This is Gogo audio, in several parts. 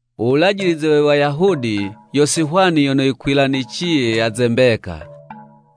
U wulajilize we Wayahudi yo si hwani yono yikwilaniciye ya ze mbeka,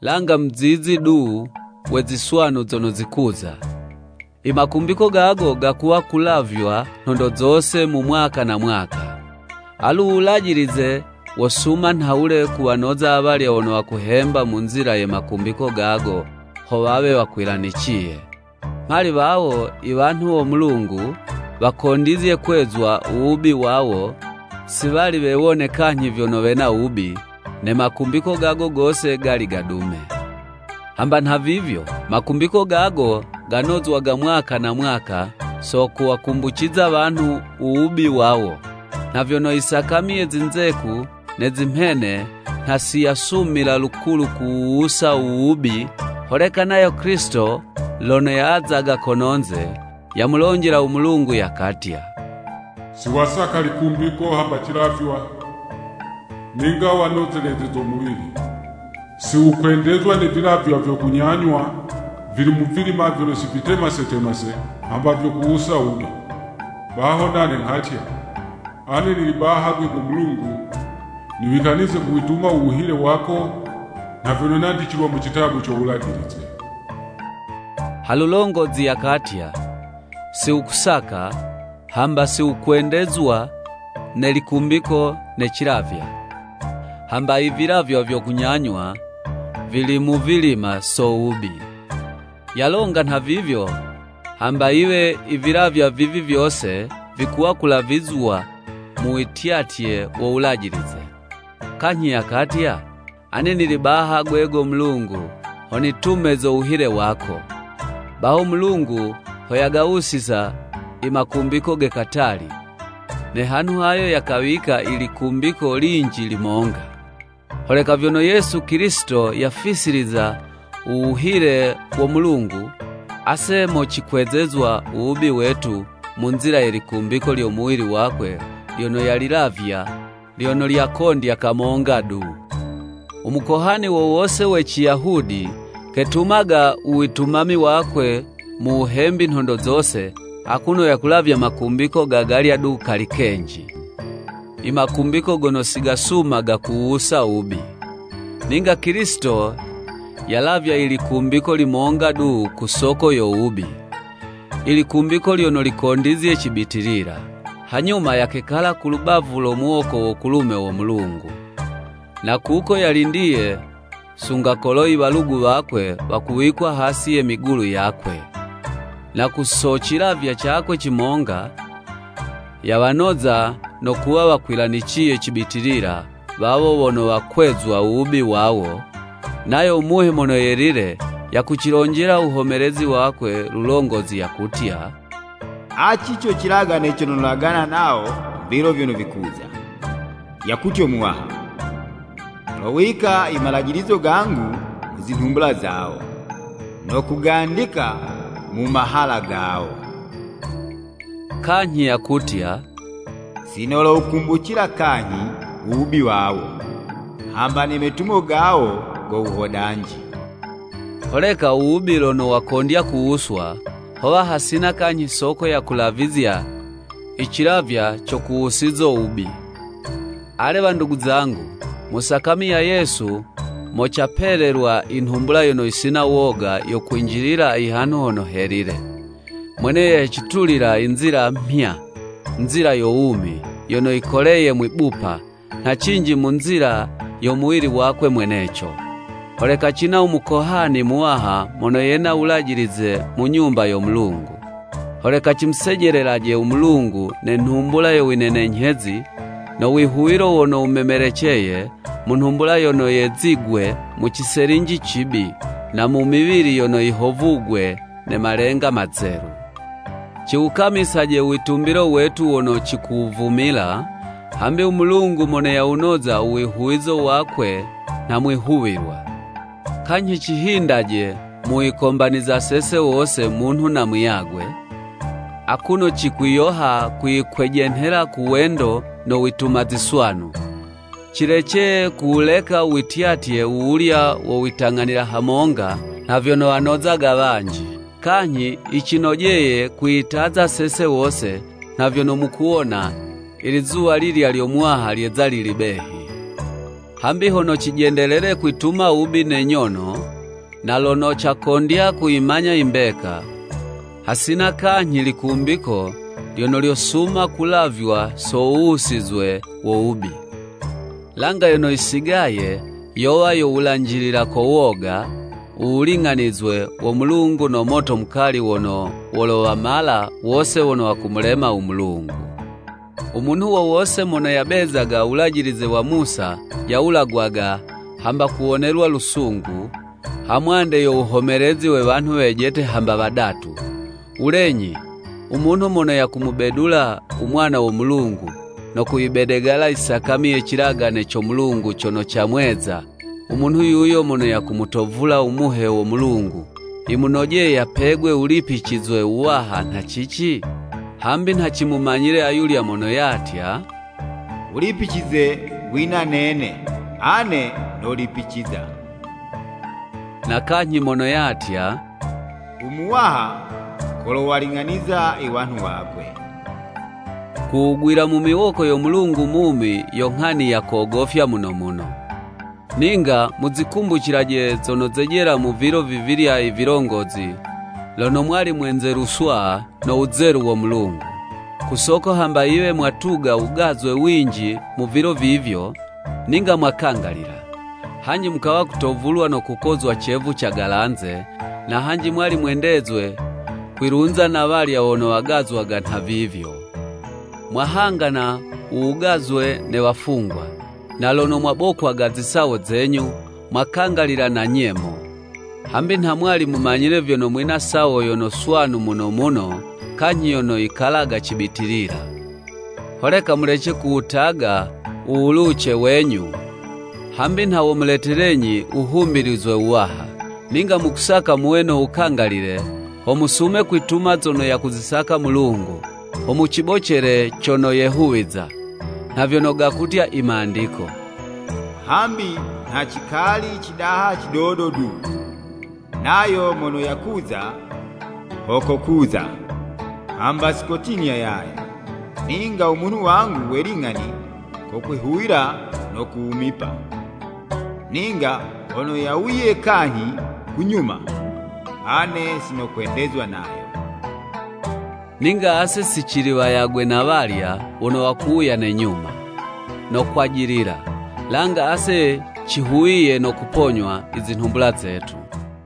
langa muzizi du we ziswanu zono zikuza. I makumbiko gago gakuwa kulavywa nhondo zose mu mwaka na mwaka. Alu u Wulajilize wosuma nhawule kuwanoza awalya wono wakuhemba mu nzila ye makumbiko gago, ho wawe wakwilaniciye. Mhali wawo i wanhu wo Mulungu wakondizye kwezwa u wubi wawo, si wali wewone kanyhi vyono wena wubi, ne makumbiko gago gose gali gadume. Hamba nhavivyo, makumbiko gago ganozwaga mwaka na mwaka so kuwakumbuciza wanhu u wubi wawo. Nha vyono i sakami ye zinzeku ne zimhene nha si yosumila lukulu kuwuwusa u wubi. Holeka nayo Kilisito lono yazaga kononze, yamulonjela u Mulungu yakatya: “Si wasaka likumbiko hamba cilavywa, ninga wanozelezezo muwili. Si wukwendezwa ne vilavywa vyo kunyanywa vili muvilima vyono si vitemasetemase, hamba vyo kuwusa wubi.” Baho nane nghatya, “Ane nili baha 'gwe go Mulungu niwikanize kuwituma u wuhile wako, nha vyono nandicilwa mu citabu co Wulajilize.” Ha lulongozi yakatya, “Si wukusaka, hamba si wukwendezwa ne likumbiko ne cilavywa, hamba i vilavywa vyo kunyanywa vili muvilima so wubi.” Yalonga nhavivyo, hamba yiwe i vilavywa vivi vyose vikuwa kulavizywa mu wityatye wo Wulajilize. Kanyhi yakatya, “Ane nili baha 'gwe go Mulungu, ho nitume zo wuhile wako.” Baho u Mulungu ho yagawusiza i makumbiko ge katali, ne hanhu hayo yakawika i likumbiko linji limonga. Holeka vyono Yesu Kilisito yafisiliza u wuhile wo Mulungu, ase mo cikwezezwa u wubi wetu mu nzila ye likumbiko lyo muwili wakwe lyono yalilavya, lyono lyakondya kamonga du. U Mukohani wo wose we Ciyahudi, ketumaga u witumami wakwe mu wuhembi nhondo zose, akuno yakulavya makumbiko ga galya du kali kenji, i makumbiko gono si gasumaga kuwuwusa wubi. Ninga Kilisito yalavya ilikumbiko limonga du ku soko yo wubi, i likumbiko lyono likondizye cibitilila, hanyuma yakekala ku lubavu lo muwoko wo kulume wo Mulungu. Na kuko yalindiye sunga kolo i walugu wakwe wakuwikwa hasi ye migulu yakwe. Na ku so cilavywa cakwe cimonga, yawanoza no kuwa wakwilaniciye cibitilila, wawo wono wakwezwa u wubi wawo. Nayo u Muhe Mono Yelile yakucilonjela uwuhomelezi wakwe, Lulongozi yakutya, “Aci co cilagane cono nolagana nawo mu vilo vyono vikuza, yakutyo Muwaha: Nolowika i malajilizo gangu mu zinhumbula zawo, no kugandika mu mahala gawo.” Kanyhi yakutya, “Si nolowukumbucila kanyhi u wubi wawo, hamba ne metumo gawo go wuhodanji. Holeka u wubi lono wakondya kuwuswa, howa hasina kanyhi soko yo kulavizya i cilavywa co kuwusizo wubi.” Ale wandugu zangu, mu sakami ya Yesu, mo capelelwa i nhumbula yono yisina woga yo kwinjilila i Hanhu Hono Helile. Mwene yo yacitulila i nzila mhya, nzila yo wumi, yono yikoleye mwibupa, nha cinji mu nzila yo muwili wakwe mweneco. Holeka cina u Mukohani Muwaha mono yena u wulajilize mu nyumba yo Mulungu. Holeka cimusejelelaje u Mulungu ne nhumbula yo winenenyhezi no wihuwilo wono wumemeleceye, mu nhumbula yono yezigwe mu ciselinji cibi, na mu miwili yono yihovugwe ne malenga mazelu. Ciwukamisaje u witumbilo wetu wono cikuwuvumila, hambi u Mulungu mono yawunoza u wihuwizo wakwe nha mwihuwilwa. Kanyhi cihindaje mu wikombaniza sese wose munhu na muyagwe, akuno cikwiyoha kwiyikwejenhela ku wendo no wituma ziswanu. Cilece kuwuleka u wityatye wuwulya wo witang'anila hamonga, nha vyono wanozaga wanji. Kanyhi yicinojeye kwiyitaza sese wose, nha vyono mukuwona, i lizuwa lilya lyo Muwaha lyeza lili behi. Hambi hono cijendelele kwituma wubi ne nyono, na lono cakondya kuyimanya i mbeka, hasina kanyhi likumbiko lyono lyosuma kulavywa so wuwusizwe wo wubi. Langa yono yisigaye yowa yo wulanjilila ko woga, u wuling'anizwe wo Mulungu no moto mukali wono wolowamala wose wono wakumulema u Mulungu. U munhu wo wose mono yabezaga u wulajilize wa Musa yawulagwaga hamba kuwonelwa lusungu, hamwande yo wuhomelezi we wanhu wejete hamba wadatu. Wulenyi, u munhu mono yakumubedula u Mwana wo Mulungu, no kuyibedegala i sakami ye cilagane co Mulungu cono ca mweza, u munhu yuyo mono yakumutovula u Muhe wo Mulungu, yimunojeye yapegwe wulipicizwe wuwaha nha cici? Hambi nha cimumanyile ayulya mono yatya, “U wulipicize wina nene, ane nolipiciza.” Na kanyhi mono yatya, “U Muwaha kolowaling'aniza i wanhu wakwe.” Ku wugwila mu miwoko yo Mulungu mumi yo nghani ya kogofya muno muno. Ninga muzikumbucilaje zono zejela mu vilo vivilya i vilongozi lono mwali mwenzeluswa no wuzelu wo Mulungu. Ku soko hamba yiwe mwatuga wugazwe winji mu vilo vivyo, ninga mwakangalila. Hanji mukawa kutovulwa no kukozwa cevu cagalanze, na hanji mwali mwendezwe kwilunza na walya wono wagazwaga nhavivyo. Mwahangana u wugazwe ne wafungwa, na lono mwabokwaga zisawo zenyu, mwakangalila na nyemo, hambi nha mwali mumanyile vyono mwina sawo yono swanu muno muno kanyhi yono yikalaga cibitilila. Holeka mulece kuwutaga u wuluwuce wenyu, hambi nha womuletelenyi wuhumbilizwe wuwaha. Ninga mukusaka muwe no wukangalile, ho musume kwituma zono yakuzisaka Mulungu, ho mucibocele cono yehuwiza. Nha vyono gakutya i Mandiko: “Hambi nha cikali cidaha cidodo du, nayo mono yakuza, ho kokuza, hamba si kotinya yaye, Ninga u munhu wangu we ling'ani kokwihuwila no kuwumipa, ninga hono yawuye kanyhi ku nyuma, ane sinokwendezwa nayo.” Ninga ase si cili wayagwe na walya wono wakuwuya ne nyuma, no kwajilila, langa ase cihuwiye no kuponywa i zinhumbula zetu.